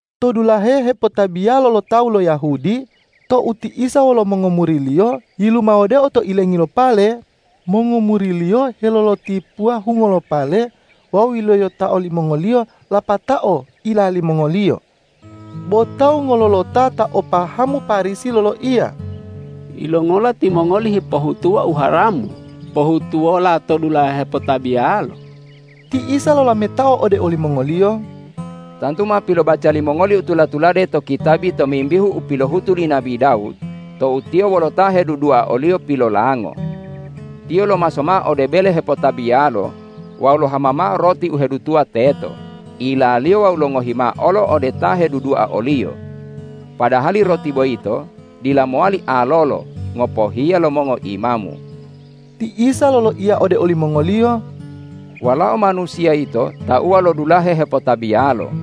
To dulahe hepotabiyalo lo tawu lo Yahudi, tou ti Isa wolo mongomuri-Liyo yilumawodeo to ilengi lo pale, mongomuri-Liyo helolotipuwa hungo lo pale wawu yiloyotao limongoliyo lapatao ila limongoliyo. Bo tawu ngololota ta o pahamu Parisi loloiya,”Yilongola timongoli hipohutuwa u haramu pohutuwola to dulahe hepotabiyalo?” Ti Isa lolametao ode olimongoliyo,”Tantu ma pilobaca limongoli u tula-tulade to kitabi tomimbihu u pilohutu li nabi Dawud tou tiyo wolo ta hedudua oliyo pilolango. Tiyo lomaso mao ode bele hepotabiyalo wawu lohama mao roti u hedutuwa teto, ilaliyo wawu longohi mao olo ode ta hedudua oliyo, padahali roti boyito dila mowali alolo, ngopohiya lo mongoimamu.” Ti Isa loloiya ode olimongoliyo,”Walao Manusiya yito tauwa lo dulahe hepotabiyalo!”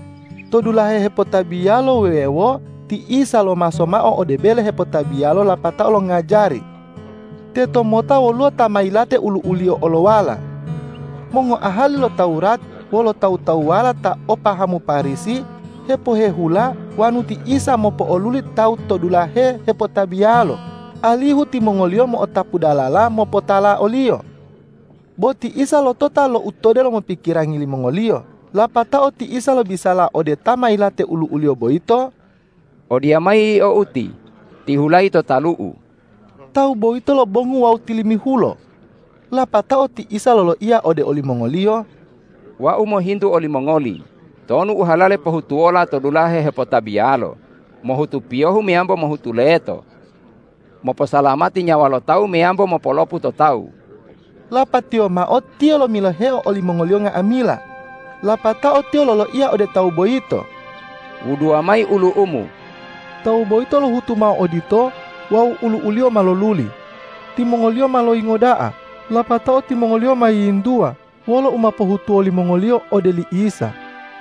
To dulahe hepotabiyalo wuwewo ti Isa lomaso mao ode bele hepotabiyalo lapatao longajari. Teto mota woluwo ta ma yilate ulu'uliyo olowala. Mongoahali lo Tawurat wolo tawu-tawuwala ta o pahamu Parisi hipohehula wonu ti Isa mopo'oluli tawu to dulahe hepotabiyalo, alihu timongoliyo mo'otapu dalala mopotala o-Liyo. Bo ti Isa lotota lo u to delomo pikirangi limongoliyo, lapatao ti Isa lobisala ode ta ma yilate ulu'uliyo boyito,”Odiyamayi yio uti, tihulayi to talu-U!” Tawu boyito lobongu wawu tilimihulo. Lapatao ti Isa loloiya ode olimongoliyo,”Wau mohintu olimongoli, tonu u halale pohutuwola to dulahe hepotabiyalo, mohutu piyohu meyambo mohutu leto? Moposalamati nyawa lo tawu meyambo mopolopu to tawu?” Lapatiyo mao Tiyo lomiloheo olimongoliyo nga'amila, lapatao Tiyo loloiya ode tawu boyito,”Wuduwa mayi ulu'umu.” Tawu boyito lohutu mao odito wawu ulu'uliyo ma loluli. Timongoliyo ma loyingo da'a, lapatao timongoliyo ma yiyintuwa, wolo u ma pohutuwo limongoliyo ode li Isa.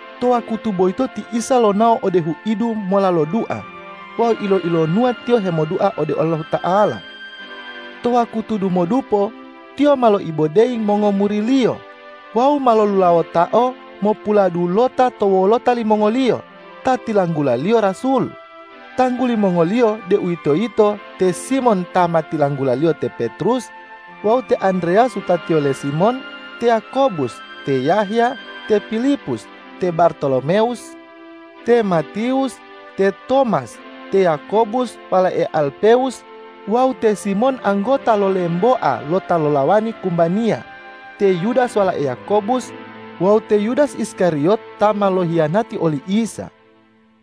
To wakutu boyito ti Isa lonao ode huidu mola lodua wawu ilo-ilonuwa Tiyo hemodua ode Allahuta'ala. Tou wakutu dumodupo Tiyo ma loibodeyi mongomuri-Liyo wawu ma lolulawotao mopuladulota to wolota limongoliyo ta tilanggula-Liyo rasul, tangguli mongoliyo, deuwitoyito te Simon ta ma tilanggula-Liyo te Petrus, wawu te Andreyas wutatiyo le Simon, te Yakobus, te Yahya, te Pilipus, te Bartolomewus, te Matiwus, te Tomas, te Yakobus walae Alpewus, wawu te Simon anggota lo lemboa lo ta lolawani kumbaniya, te Yudas walae Yakobus wawu te Yudas Iskariyot ta ma lohiyanati oli Isa.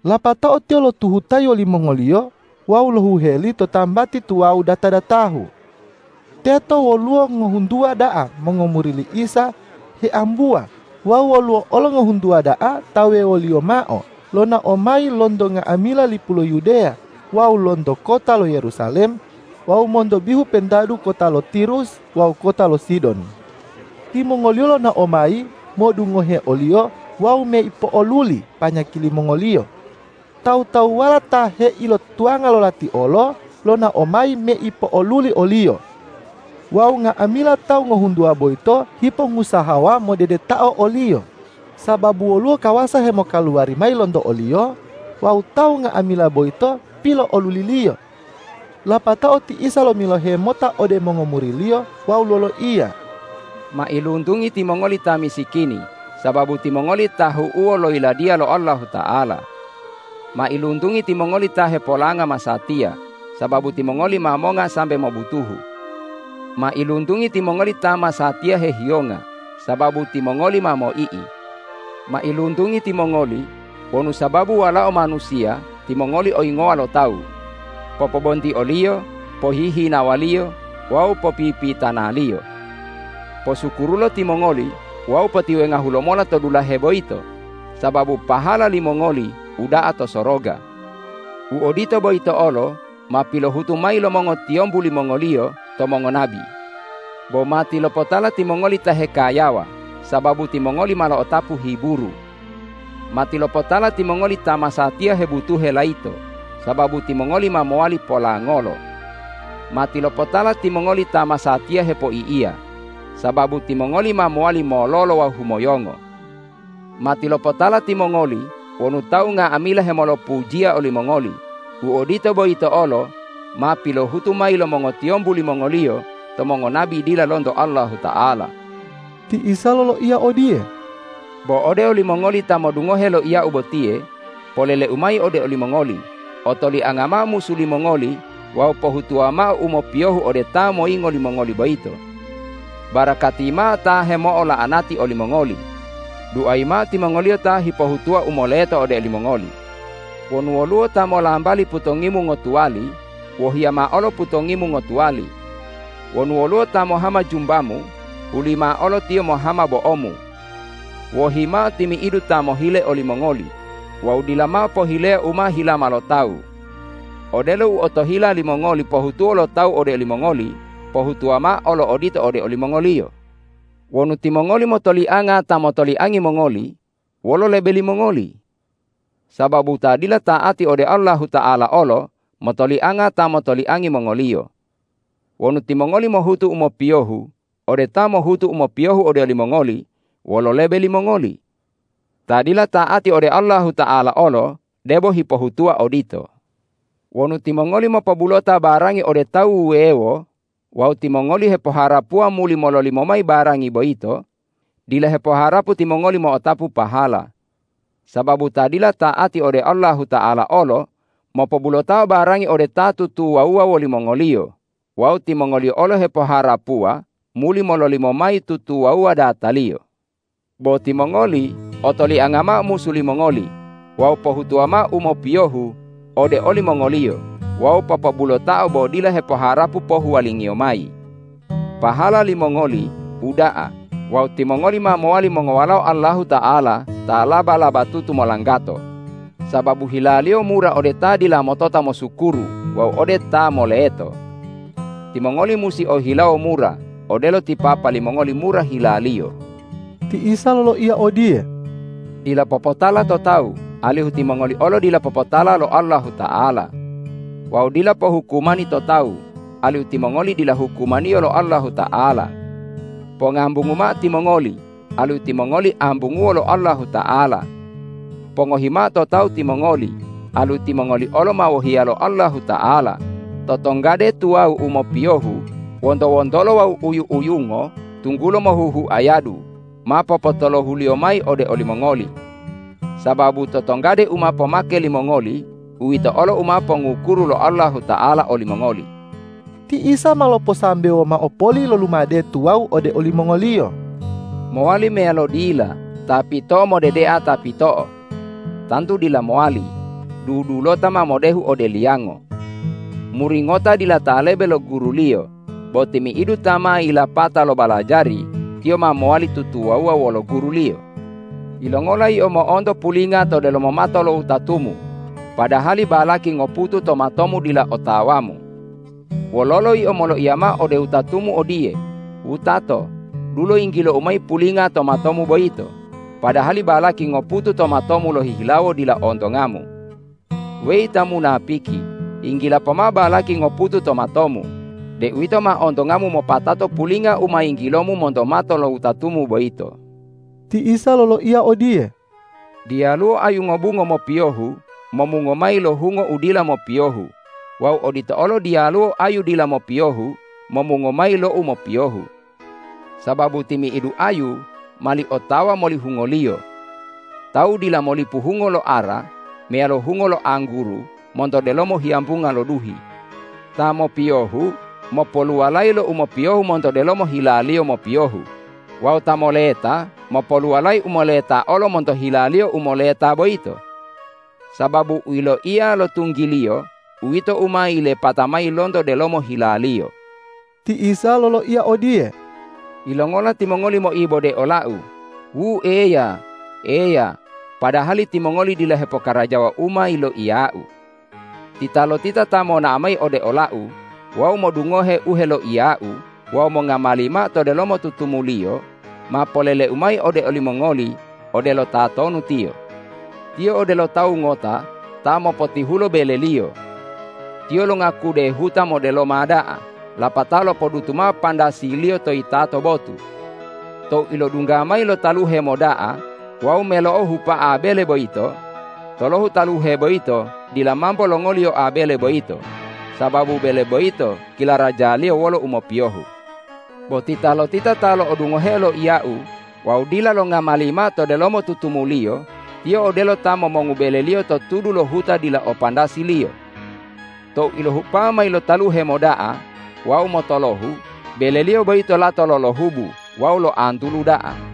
Lapatao Tiyo lotuhutayi wolimongoliyo wawu lohuheli to tambati tuwawu data-datahu. Teto woluwo ngohuntuwa da'a mongomuri li Isa hiambuwa wawu woluwo olo ngohuntuwa da'a ta wuwewoliyo mao lonao mayi lonto nga'amila lipu lo Yudeya wawu lonto kota lo Yerusalem wawu monto bihu pentadu kota lo Tirus wawu kota lo Sidon. Timongoliyo lonao mayi modungohe o-Liyo wawu meipo'oluli panyaki limongoliyo. Tawu-tawuwala ta heilotuwanga lo lati olo lonao mayi meipo'oluli o-Liyo. Wawu nga'amila tawu ngohuntuwa boyito hipongusahawa modedetao o-Liyo, sababu woluwo kawasa hemokaluwari mayi lonto o-Liyo wawu tawu nga'amila boyito pilo'oluli-Liyo. Lapatao ti Isa lomilohe mota ode mongomuri-Liyo wawu loloiya,”Mailuntungi timongoli ta misikini, sababu timongoli tahu'uwo lo Yiladiya lo Allahuta'ala! Mailuntungi timongoli ta hepolanga masatiya, sababu timongoli ma monga sambe mobutuhu! Mailuntungi timongoli ta masatiya hehiyonga, sababu timongoli ma moi'i! Mailuntungi timongoli wonu sababu Walao Manusiya timongoli oyingowa lo tawu, popobontioliyo, pohihinawaliyo wawu popipitanaliyo. Posukurulo timongoli wawu potiwengahu lomola to dulahe boyito, sababu pahala limongoli uda'a to soroga. U odito boyito olo ma pilohutu mayi lo mongotiyombu limongoliyo to mongonabi. Bo matilopotala timongoli ta hekayawa, sababu timongoli ma lo'otapu hiburu! Matilopotala timongoli ta masatiya hebutuhe layito, sababu timongoli ma mowali polangolo! Matilopotala timongoli ta masatiya hepoi'iya, sababu timongoli ma mowali mololo wawu humoyongo! Matilopotala timongoli wonu tawu nga'amila hemolopujiya olimongoli, u odito boyito olo ma pilohutu mayi lo mongotiyombu limongoliyo to mongonabi dila lonto Allahuta'ala.” Ti Isa loloiya odiye,”Bo ode olimongoli ta modungohe loiya-U botiye, polele-U mayi ode olimongoli: Otolianga mao musu limongoli wawu pohutuwa mao u mopiyohu ode ta moyingo limongoli boyito. Barakati mao ta hemo'ola'anati olimongoli; duayi mao timongoliyo ta hipohutuwa u moleto ode olimongoli. Wonu woluwo ta molambali putongimu ngotuwali, wohiya mao olo putongimu ngotuwali. Wonu woluwo ta mohama jumbamu, hulimao olo tiyo mohama bo'omu. Wohi mao timi'idu ta mohile olimongoli wawu dila mao pohileya u ma hilama lo tawu. Odelo u otohila limongoli pohutuwo lo tawu ode olimongoli, pohutuwa mao olo odito ode olimongoliyo. Wonu timongoli motolianga ta motoliangi mongoli, wolo lebe limongoli? Sababu ta dila ta'ati ode Allahuta'ala olo motolianga ta motoliangi mongoliyo. Wonu timongoli mohutu u mopiyohu ode ta mohutu u mopiyohu ode olimongoli, wolo lebe limongoli? Ta dila ta'ati ode Allahuta'ala olo debo hipohutuwa odito. Wonu timongoli mopobulota barangi ode tawu wuwewo wawu timongoli hepoharapuwa muli mololimo mayi barangi boyito, dila hepoharapu timongoli mo'otapu pahala. Sababu ta dila ta'ati ode Allahuta'ala olo mopobulotao barangi ode ta tutuwawuwa wolimongoliyo wawu timongoliyo olo hepoharapuwa muli mololimo mayi tutuwawuwa dataliyo. Bo timongoli, otolianga mao musu limongoli wawu pohutuwa mao u mopiyohu ode olimongoliyo wawu popobulotao bo dila hepoharapu pohuwalingiyo mayi. Pahala limongoli uda'a wawu timongoli ma mowali mongowalao Allahuta'ala ta laba-labatutu molanggato, sababu hila-Liyo mura ode ta dila motota mosukuru wawu ode ta moleto. Timongoli musi o hilawo mura, odelo ti Papa limongoli mura hila-Liyo.” Ti Isa loloiya odiye,”Dila popotala to tawu, alihu timongoli olo dila popotala lo Allahuta'ala. Wawu dila pohukumani to tawu, alihu timongoli dila hukumaniyo lo Allahuta'ala. Pongambungu mao timongoli, alihu timongoli ambunguwo lo Allahuta'ala. Pongohi mao to tawu timongoli, alihu timongoli olo ma wohiya lo Allahuta'ala, totonggade tuwawu u mopiyohu, wonto-wontolo wawu uyu-uyungo, tunggulo mohuhuayadu ma popotolohu-Liyo mayi ode olimongoli. Sababu totonggade u ma pomake limongoli, uwito olo u ma pongukuru lo Allahuta'ala olimongoli.” Ti Isa ma loposambewo mao poli lo lumade tuwawu ode olimongoliyo,”Mowali meyalo dila ta pito'o modedea ta pito'o? Tantu dila mowali, dudulota ma modehu ode liyango. Muri ngota dila ta lebe lo guruliyo; bo timi'idu ta ma yilapata lobalajari, tiyo ma mowali tutuwawuwa wolo guruliyo. Yilongola yio mo'onto pulinga to delomo mato lo wutatumu, padahali balaki ngoputu to matomu dila otawamu? Wololo yio moloiya mao ode wutatumu odiye, wutato, dulo yinggilou mayi pulinga to matomu boyito, padahali balaki ngoputu to matomu lohihilawo dila ontongamu? Weyi ta munapiki, yinggila pomao balaki ngoputu to matomu, deuwito ma ontongamu mopatato pulinga u ma yinggilomu monto mato lo wutatumu boyito.” Ti Isa loloiya odiye,”Diyaluwo ayu ngobungo mopiyohu momungo mayi lo hungo u dila mopiyohu wawu odito olo diyaluwo ayu dila mopiyohu momungo mayi lo u mopiyohu. Sababu timi'idu ayu mali otawa moli hungoliyo. Tawu dila molipu hungo lo ara meyalo hungo lo angguru monto delomo hiyambunga lo duhi. Ta mopiyohu mopoluwalayi lo u mopiyohu monto delomo hilaliyo mopiyohu wawu ta moleta mopoluwalayi u moleta olo monto hilaliyo u moleta boyito. Sababu u yiloiya lo tunggiliyo, uwito u ma yilepata mayi lonto delomo hilaliyo.” Ti Isa loloiya odiye,”Yilongola timongoli moibode ola-U, wu Eya, Eya, padahali timongoli dila hepokarajawa u ma yiloiya-U? Titalotita ta monao mayi ode ola-U wawu modungohe u heloiya-U wawu mongamali mao to delomo tutumuliyo, ma polele-U mayi ode olimongoli odelo tatonu tiyo. Tiyo odelo tawu ngota ta mopotihulo beleliyo. Tiyo longakude huta modeloma da'a lapatao lopodutu mao pandasiliyo to yitato botu. Tou ilodungga mayi lo taluhe moda'a wawu melo'ohupa'a bele boyito, tolohu taluhe boyito dila mambo longoliyoa bele boyito, sababu bele boyito kilarajaliyo wolo umopiyohu. Bo titalotita ta lo'odungoheo loiya-U wawu dila longamali mao to delomo tutumuliyo, tiyo odelo ta momongu beleliyo to tudu lo huta dila o pandasiliyo. Tou ilohupa'a mayi lo taluhe moda'a wawu motolohu, beleliyo boyito lato lolohubu wawu loantulu da'a!”